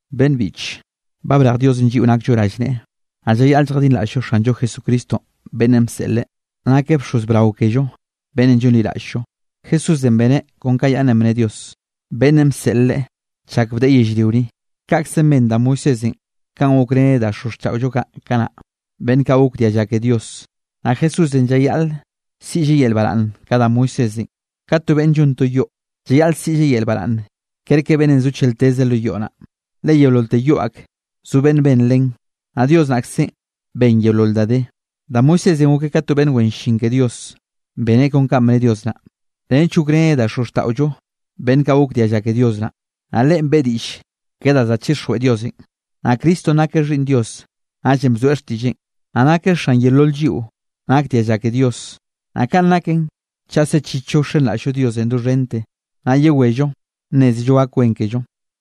Beꞌnn biꞌche, ba brej Diosenꞌ lliꞌo nakllo rallneꞌe, naꞌ llayaꞌl lljadinraꞌll-llo Xanllo Jesucristo beꞌnnenꞌ bseꞌleꞌ. Nakeꞌ bxoz brao kello beꞌnnenꞌ llonliraꞌll-llo. Jesúsenꞌ beneꞌ kon ka yaꞌnnenꞌ bne Dios, beꞌnnenꞌ bseꞌl Leꞌe chak bdeꞌe yellrio ni, kaꞌkzenꞌ ben da Moisésenꞌ kanꞌ gokreneꞌ da xozxtaꞌollo kaꞌ kanaꞌ, beꞌnn kaꞌ gok dialla ke Dios. Naꞌ Jesúsenꞌ llayaꞌl siꞌlleꞌ yel baraꞌnn ka da Moisésenꞌ, ka to beꞌnn llon to yoꞌ, llayaꞌl siꞌlleꞌ yel baraꞌnn kerke beꞌnnenꞌ zo chelteze lo yoꞌ naꞌ. Le yeololte yoꞌ ak, zo beꞌnn ben len, naꞌ Dios naꞌkzenꞌ ben yeolol da de. Da Moisésenꞌ gokeꞌ ka to beꞌnn wen llin ke Dios, beneꞌ kon kanꞌ bne Dios naꞌ, nench gokreneꞌ da xozxtaꞌollo beꞌnn kaꞌ gok dialla ke Dios naꞌ. Naꞌ leꞌen beꞌe diꞌll ke da kaꞌ za chixjweꞌ Diosenꞌ. Naꞌ Cristonꞌ nakeꞌ Xhiꞌnn Dios, naꞌllenꞌ bzoeꞌ xtiꞌlleꞌn, naꞌ nakeꞌ xan yeolol lliꞌo nak dialla ke Dios. Naꞌ kaꞌn naken chaꞌ sechichllo wxenraꞌll-llo Diosenꞌ doxhente, naꞌ llawello nnézello gak wen kello.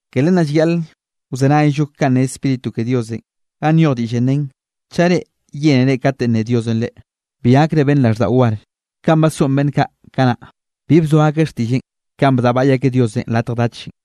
Ke len naꞌ llayaꞌl wzenayllo kanꞌ ne Spíritu ke Diosenꞌ ganꞌ nyoj diꞌllenꞌ nen: Chaꞌ reꞌ yénere kate nne Diosenꞌ reꞌ, bi gakre beꞌnn raꞌlldaꞌo war, kanꞌ basoꞌn beꞌnn kaꞌ kanaꞌ, bi bzoa akeꞌ xtiꞌlleꞌn kanꞌ bdaꞌbaꞌy akeꞌ Diosenꞌ latj dachenꞌ.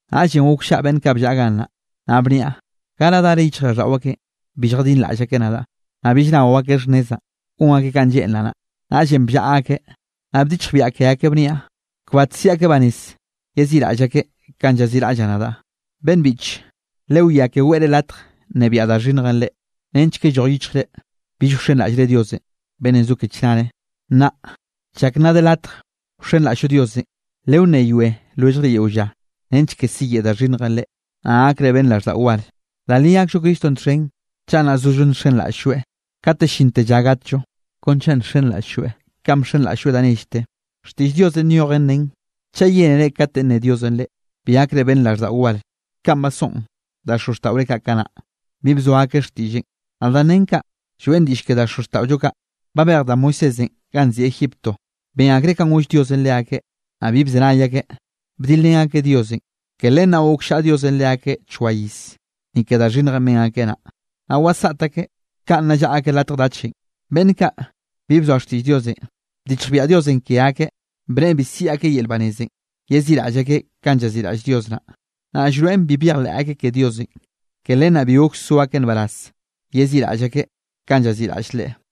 Naꞌllenꞌ gokllaꞌa beꞌnn kaꞌ bllaꞌa gannaꞌ, naꞌ bniaꞌ: “¿Gara dara yichjraꞌlldaꞌo akeꞌn, bi lljadinraꞌll akeꞌ nadaꞌ? Naꞌ bill nao akeꞌ xhnnezaꞌn, gon akeꞌ kanꞌ lleꞌnraꞌ naꞌ.” Naꞌllenꞌ bllaꞌa akeꞌ, naꞌ bdichjbiaꞌ ke akeꞌ bniaꞌ: “Kbat siꞌi akeꞌ banez yeziꞌraꞌll akeꞌ kanꞌ llaziꞌraꞌllaꞌ nadaꞌ.” Beꞌnn biꞌche, lewiá ke weꞌre latj nnebiaꞌ da xhinnjenꞌ reꞌ, nench ke lloj yichjre bill wxenraꞌllre Dios beꞌnnenꞌ zo ke chnare. Nnaꞌ chak nna de latj wxenraꞌll-llo Dios, lewnneyoe lwelljre yeo lla, nench ke siyeꞌe da xhinnjenꞌ reꞌ, naꞌ gakre beꞌnn raꞌlldaꞌo war. Da li gakllo Cristonꞌ txhen, chaꞌ nna zollo nxenraꞌll-lloeꞌ kate llinte lla gatllo, kon chaꞌ nxenraꞌll-lloeꞌ kanꞌ bxenraꞌll-lloeꞌ da nellte. Xtiꞌll Diosenꞌ nyojen nen: Chaꞌ yénere kate nne Diosenꞌ reꞌ, bi gakre beꞌnn raꞌlldaꞌo war kanꞌ basoꞌn da xozxtaꞌore kaꞌ kanaꞌ, bi bzoa akeꞌ xtiꞌlleꞌn. Naꞌ danꞌ nen kaꞌ, lloeꞌn diꞌll ke da xozxtaꞌollo kaꞌ babej da Moisésenꞌ ganꞌ nziꞌi Egipto. Ben akreꞌ kanꞌ goll Diosenꞌ leakeꞌ, naꞌ bi bzenay akeꞌ, bdilrén akeꞌ Diosenꞌ. Ke len naꞌ gokllaꞌa Diosenꞌ leakeꞌ choa iz, ni ke da xhinnjenꞌ ben akeꞌ naꞌ, naꞌ wasaꞌt akeꞌ kanꞌ nna llaꞌa akeꞌ latj dachenꞌ. Beꞌnn kaꞌ, bi bzoa xtiꞌll Diosenꞌ, bdichjbiaꞌ Diosenꞌ ke akeꞌ, bneꞌe bi siꞌi akeꞌ yel nbarazenꞌ, yeziꞌraꞌll akeꞌ kanꞌ llaziꞌraꞌll Dios naꞌ. Naꞌ llroeꞌn bi byejleꞌ akeꞌ ke Diosenꞌ, ke len naꞌ bi gok so akeꞌ nbaraz yeziꞌraꞌll akeꞌ kanꞌ llaziꞌraꞌll Leꞌe.